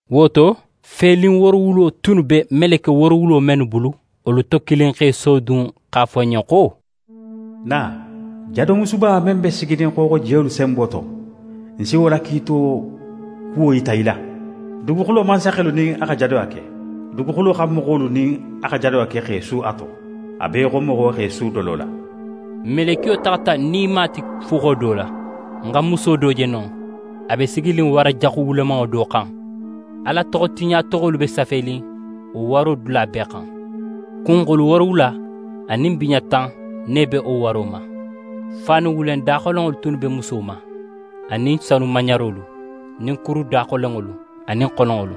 Wo to, felin woorowulo tunnu be meleke woorowulo mennu bulu, wolu to kilin x'é sodun x'a fo ń ɲen xo: «Na, jadomusuba men be siginin xooxojiyolu senbo to, ń si wo la kiito kuwo yita í la. Duguxulo mansaxelu nin a xa jadoya ke. Duguxulo xan moxolu nin a xa jadoya ke x'e su a to, a be í xo moxo x'é su dolo la.» Melekiyo taxata ń nima ti fuxo do la. Ń xa muso do je non, a be siginin wara jaxu wulemanŋo do xan. Ala toxotiɲatoxolu be safenin wo waro dula bee xan. Kunxulu woorowula anin biɲa tan ne be wo waro ma. Faanu wulen daxolenŋolu tunnu be muso ma, anin sanu maɲarolu nin kuru daxolenŋolu anin xononŋolu.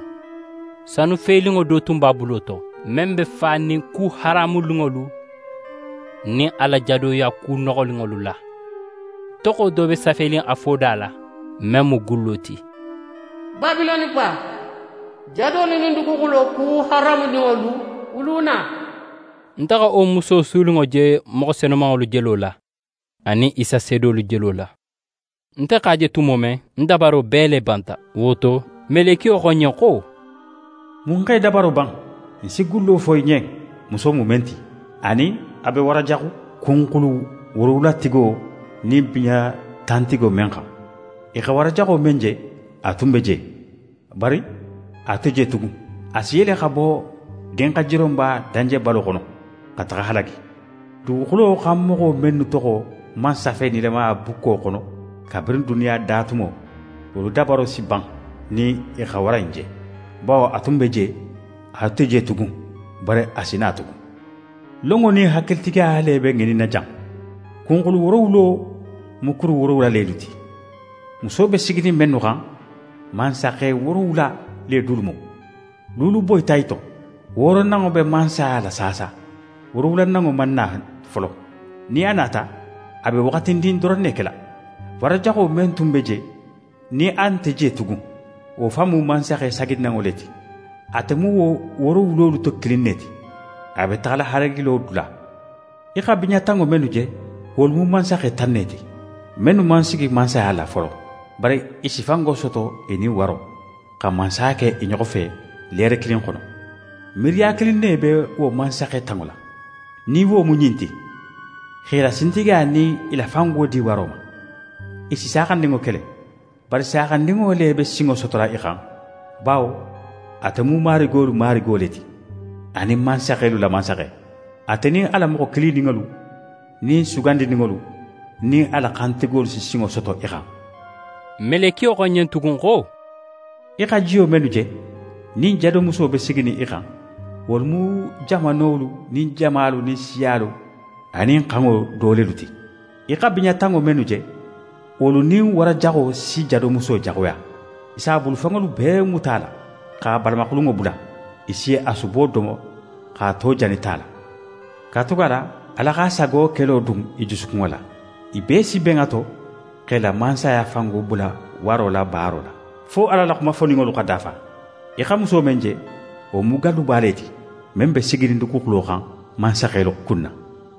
Sanufelinŋo do tun b'a bulo to, men be fanin ku haramuninŋolu nin a la jadoya ku noxoninŋolu la. Toxo do be safenin a foda la, men mu gullo ti: «Babiloneba, jadolu nin duguxulo ku haramuninŋolu wuluna.» Nte xa wo muso suninŋo je moxo senumanŋolu jelo la, anin Isa seedolu jelo la. Nte x'a je tumo men, ń dabaro bee le banta. Wo to, melekiyo xo ń ɲen xo: «Mun x'é dabaro ban? Ń si gullo fo í ɲen, muso mu men ti, anin a be wara jaxu kunxulu woorowulatigo nin biɲa tantigo men xan. Í xa wara jaxo men je, a tun be je, bari a nte je tugun. A si yele xa bo dinxajironba danjebalo xono, xa taxa halagi. Duguxulo xan moxo mennu toxo man safe nilamaya bukko xono kabirin duniya da tumo, wolu dabaro si ban nin i xa wara in je, bawo a tun be je, a nte je tugun, bari a si na tugun. «Lonŋo nin hakilitigiya le be ŋininnin jan. Kunxulu woorowulo mu kuru woorowula lelu ti, muso be siginin mennu xan. Mansaxe woorowula le dulu mu. Luulu boyita i to, wooronanŋo be mansaya la saasa, woorowulananŋo man na folo. Nin a nata, a be waxatindin doron ne kela. Wara jaxo men tun be je, nin a nte je tugun, wo fan mu mansaxe saginanŋo le ti. Ate mu wo woorowulolu to kilin ne ti, a be taxala halagilo dula. «Í xa biɲa tanŋo mennu je, wolu mu mansaxe tan ne ti, mennu man sigi mansaya la folo. Bari i si fango soto i nin waro, xa mansaya ke i ɲoxo fe leere kilin xono. Miiriya kilin ne be wo mansaxe tanŋo la, nin wo mu ɲin ti: X'e la sintigiya nin i la fango di waro ma. I si Saaxandinŋo kele. Bari Saaxandinŋo le be sinŋo sotola i xan, bawo ate mu marigolu Marigi le ti, anin mansaxelu la Mansaxe. Ate nin a la moxo kilininŋolu nin sugandininŋolu nin a la xantigolu si sinŋo soto i xan.» Melekiyo xo ń ɲen tugun xo: «Í xa jiyo mennu je, nin jadomuso be siginin i xan, wolu mu jamanolu nin jamalu nin siyalu anin xanŋolu do lelu ti. Í xa biɲa tanŋo mennu je, wolu nin wara jaxo si jadomuso jaxuya. I s'a bulufenŋolu bee muta a la, x'a balamaxulunŋo bula. I si a subo domo x'a to jani ta la. Katugala Ala x'a sago kelo dun i jusukunŋo la. I bee si ben a to x'e la mansaya fango bula waro la baaro la, fo Ala la xuma foninŋolu xa dafa. «Í xa muso men je, wo mu galluba le ti, men be siginin duguxulo xan mansaxelu kunna.»